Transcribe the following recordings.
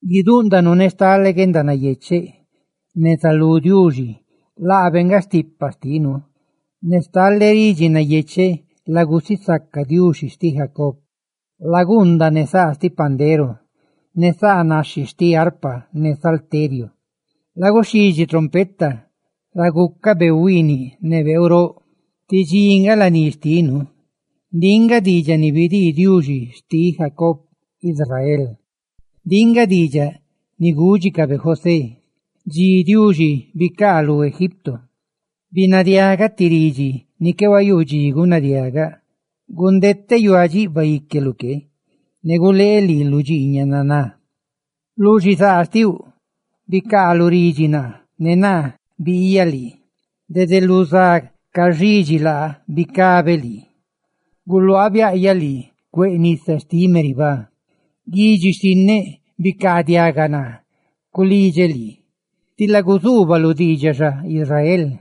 ¡Guidúꞌndanu ne stale guendanayecheꞌ neza lú Diuxi, laabe nga stipa xtinu! ¡Ne stale ridxi nayecheꞌ la gusisaca Diuxi xtiꞌ Jacob! Laguundaꞌ ne saa xtiꞌ pandero, ne saa naxhi xtiꞌ arpa ne salteriu. Laguxhidxi trompeta ra guicá beeu huiiniꞌ ne beeu roꞌ, tí dxi ca nga laní xtinu. Ndiꞌ nga ti diidxaꞌ biaꞌ ni bidii Diuxi xtiꞌ Jacob Israel; ndiꞌ nga diidxaꞌ ni gúdxicabe José dxi Diuxi bicaalú Egipto. Binadiaꞌgaꞌ ti ridxi ni qué huayuu dxi gunadiaꞌgaꞌ: «Gundeteꞌ yuáꞌ dxiꞌbaꞌ xíqueluꞌ que, ne guleeꞌ lii lu dxiiñaꞌ naná. Lu xizaa xtiuꞌ bicaaluꞌ ridxi naa, ne naa bilaꞌyaꞌ lii; dede lu za caxidxi laa bicabe lii; guluaaꞌ biaꞌyaꞌ lii cueꞌ nisa xtiꞌ Meribá. Bicaadiaga, guidxi xtinneꞌ, naa culidxeꞌ lii; ¡tila guzuubaluꞌ diidxaꞌ xa, Israel!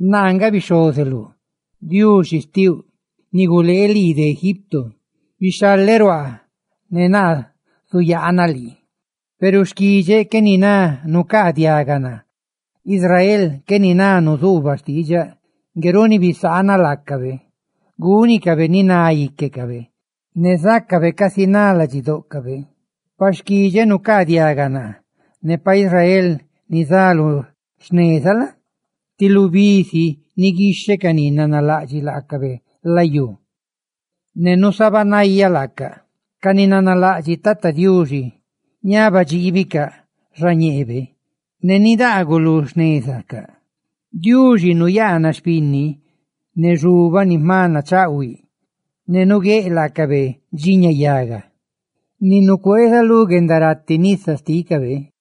Naa nga bixhozeluꞌ, Diuxi xtiuꞌ, ni gulee lii de Egipto; bixhaleꞌ ruaa, ne naa zuyaanaꞌ lii. »Peru xquidxeꞌ qué niná nucaa diaga naa; ¡Israel qué niná nuzuubaꞌ xtiidxaꞌ! Ngue runi bisaanaꞌ laacabe gúnicabe ni na íquecabe, ne bibánicabe casi na íquecabe. ¡Pa xquidxeꞌ nucaa diaga naa! ¡Ne pa Israel nizá lu xnezaꞌ la? ti lubí si niguixheꞌ ca ni nanalaꞌdxiꞌ laacabe layú, ne nusabanayaꞌ laacaꞌ!» Ca ni nanalaꞌdxiꞌ Tata Diuxi, ñaba dxiibicaꞌ xañeebe, ne nidaaguꞌ ca lu xnezacaꞌ. Diuxi nuyaanaꞌ xpinni ne xubaꞌ ni jma nachaꞌhuiꞌ, ne nuguéꞌ laacabe dxiña yaga ni nucueeza lu guendarati nisa xtícabe.